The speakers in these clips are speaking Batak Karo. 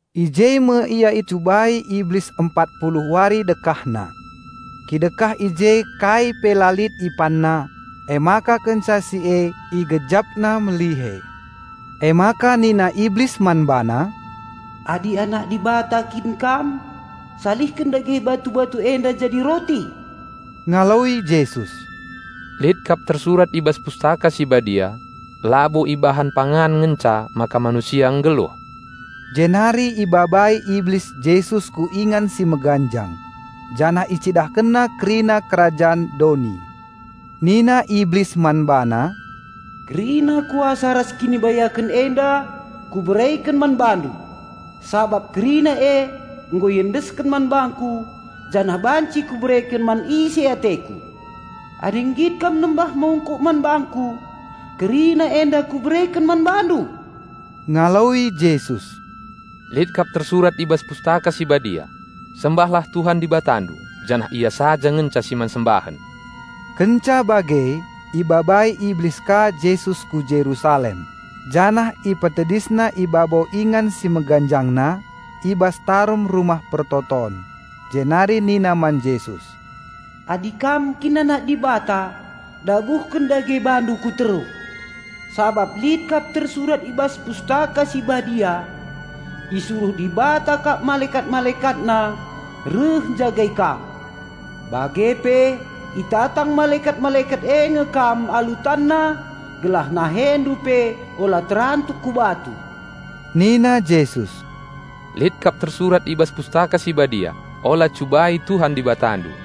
I je me Ia icubai Iblis empat puluh wari dekahna. Kidekah i je kai pe la lit IpanNa, emaka kenca si e IgejapNa melihe. Emaka nina Iblis man BaNa, "Adi Anak Dibata kin Kam salihken dage batu-batu enda jadi roti." Ngaloi Jesus, "Lit kap tersurat i bas Pustaka Si Badia, 'Labo ibahan pangan ngenca maka manusia nggeluh.'" Jenari ibabai Iblis Jesus ku ingan si meganjang, janah icidahkenna kerina kerajan doni. Nina Iblis man BaNa, "Kerina kuasa ras kinibayaken enda kubereken man BaNdu, sabap kerina e nggo iendesken man bangku janah banci kubereken man ise ateku. Adi nggit Kam nembah mungkuk man bangku, kerina enda kubereken man BaNdu." Ngaloi Jesus, "Lit kap tersurat i bas Pustaka Si Badia, 'Sembahlah Tuhan Dibatandu, janah Ia saja ngenca si man sembahen!'" Kenca bage ibabai Iblis ka Jesus ku Jerusalem janah ipetedisna i babo ingan si meganjangna i bas tarum Rumah Pertoton, jenari nina man Jesus, "Adi kam kin Anak Dibata, dabuhken dage BaNdu ku teruh. Sabap lit kap tersurat i bas Pustaka Si Badia, 'Isuruh Dibata kap malekat-MalekatNa reh njagai Kam,' bage pe itatang malekat-malekat e nge Kam alu tanna gelah NaheNdu pe ula terantuk ku batu." Nina Jesus, "Lit kap tersurat i bas Pustaka Si Badia, 'Ola cubai Tuhan Dibatandu.'"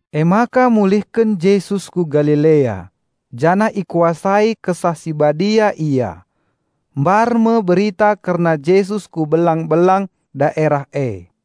Emaka mulihken Jesus ku Galilea, janah ikuasai Kesah Si Badia Ia. Mbar me berita kerna Jesus ku belang-belang daerah e.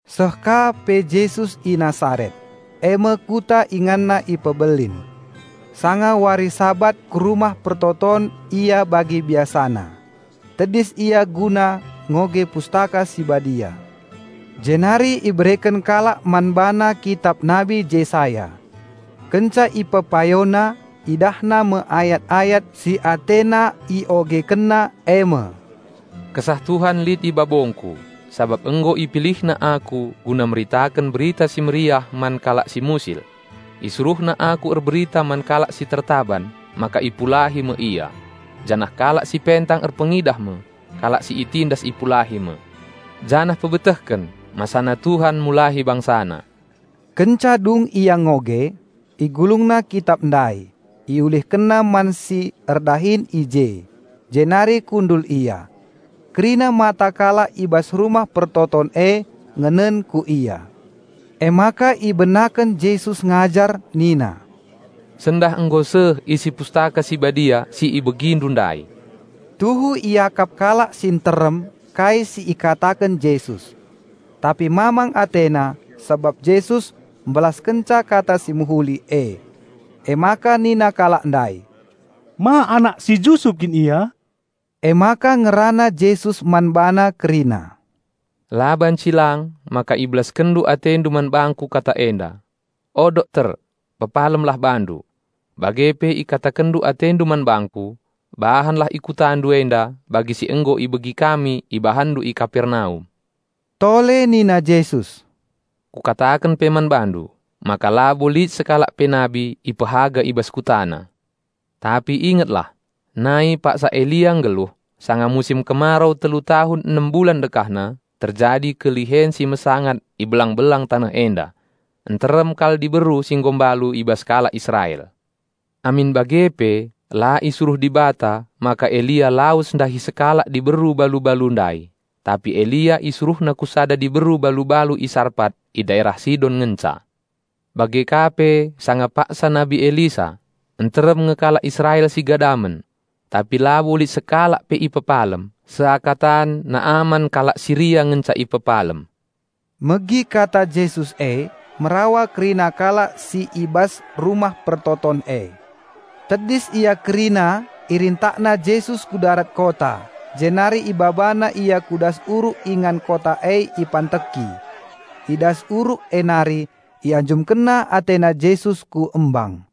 Seh ka pe Jesus i Nasaret, e me kuta InganNa ipebelin. Sanga wari Sabat ku rumah persembahen Ia bagi biasana. Tedis Ia guna ngoge Pustaka Si Badia. Jenari ibereken kalak man BaNa kitap Nabi Jesaya. Kenca IpepayoNa, IdahNa me ayat-ayat si AteNa IogekenNa e me, "Kesah Tuhan lit i babongKu, sabap nggo IpilihNa Aku guna meritaken Berita Si Mehuli man kalak si musil. IsuruhNa Aku erberita man kalak si tertaban maka ipulahi me ia, janah kalak si pentang erpengidah me, kalak si itindas ipulahi me. Janah mpebetehken masana Tuhan mulahi BangsaNa." Kenca dung Ia ngoge, IgulungNa kitap ndai, IulihkenNa man si erdahin i je, jenari kundul Ia. Kerina mata kalak i bas rumah persembahen e ngenen ku Ia. Emaka ibenaken Jesus ngajar nina, "Sendah nggo seh isi Pustaka Si Badia si ibegindu ndai." Tuhu iakap kalak si nterem kai si ikataken Jesus, tapi mamang atena sabap Jesus mbelaskenca kata si mehuli e. Emaka nina kalak ndai, "Ma anak si Jusup kin Ia?" Emaka ngerana Jesus man bana kerina, "La banci lang maka ibelaskenndu atendu man bangKu kata enda, 'O dokter, pepalemlah bandu.' Bage pe ikatakenndu atendu man bangKu, 'Bahanlah i KutaNdu enda bagi si nggo ibegi kami IbahanNdu i Kapernaum.'" Tole nina Jesus, "Kukataken pe man bandu, maka labo lit sekalak pe nabi ipehaga i bas kutana. Tapi ingetlah: nai paksa Elia nggeluh, sanga musim kemarau telu tahun enem bulan dekahna terjadi kelihen si mesangat i belang-belang taneh enda, nterem kal diberu si nggo mbalu i bas kalak Israel. Amin bage pe la isuruh Dibata maka Elia lawes ndahi sekalak diberu balu-balu ndai, tapi Elia IsuruhNa ku sada diberu balu-balu i Sarpat i daerah Sidon ngenca. Bage ka pe sanga paksa Nabi Elisa, nterem nge kalak Israel si gadamen. Tapi labo lit sekalak pe ipepalem, seakatan Naman kalak Siria ngenca ipepalem." Megi kata Jesus e, merawa kerina kalak si i bas rumah persembahen e. Tedis ia kerina irintakna Jesus ku darat kota jenari ibabana Ia ku das uruk ingan kota e ipanteki. I das uruk e nari ianjumkenna atena Jesus ku embang.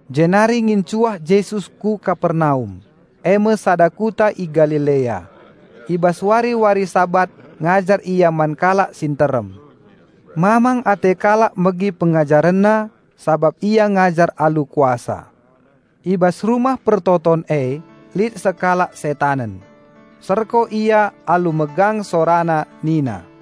Jenari ngincuah Jesus ku Kapernaum, e me sada kuta i Galilea. I bas wari-wari Sabat ngajar Ia man kalak si nterem. Mamang ate kalak megi PengajarenNa sabap Ia ngajar alu kuasa. I bas rumah persembahen e lit sekalak setanen; serko ia alu megang sorana nina,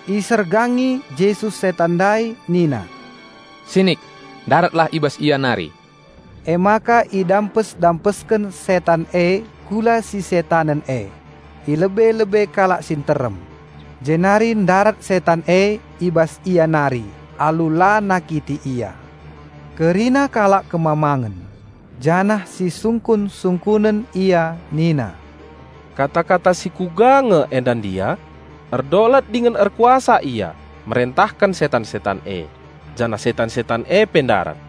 Isergangi Jesus setan ndai nina, "Sinik! Ndaratlah i bas ia nari!" Emaka idampes-dampesken setan e kula si setanen e, i lebe-lebe kalak si nterem, jenari ndarat setan e i bas ia nari alu la nakiti ia. Kerina kalak kemamangen, janah sisungkun-sungkunen ia, nina, "Kata-kata si kuga nge enda ndia? Erdolat dingen erkuasa Ia merentahken setan-setan e, janah setan-setan e pe ndarat."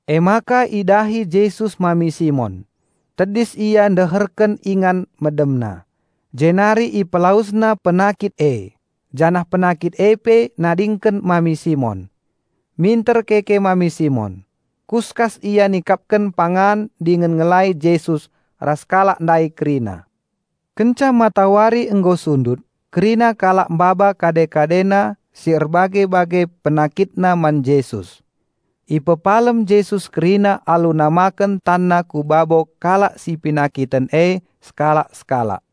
Emaka idahi Jesus mami Simon, tedis la deherken ingan medemna, jenari IpelawesNa penakit e, janah penakit e pe nadingken mami Simon. Minter keke mami Simon, kuskas ia nikapken pangan dingen ngelai Jesus ras kalak ndai kerina. Kenca matawari nggo sundut, kerina kalak maba kade-kadena si erbage-bage penakitna man Jesus. Ipepalem Jesus kerina alu namaken TanNa ku babo kalak si penakiten e sekalak-sekalak.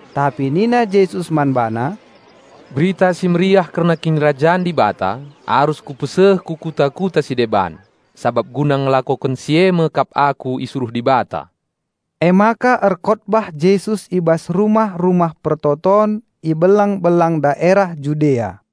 Tapi nina Jesus man bana, "Berita Si Mehuli kerna Kinirajan Dibata arus Kupeseh ku kuta-kuta si deban, sabap guna ngelakoken si e me kap Aku isuruh Dibata." Emaka erkotbah Jesus i bas rumah-rumah persembahen i belang-belang daerah Judea.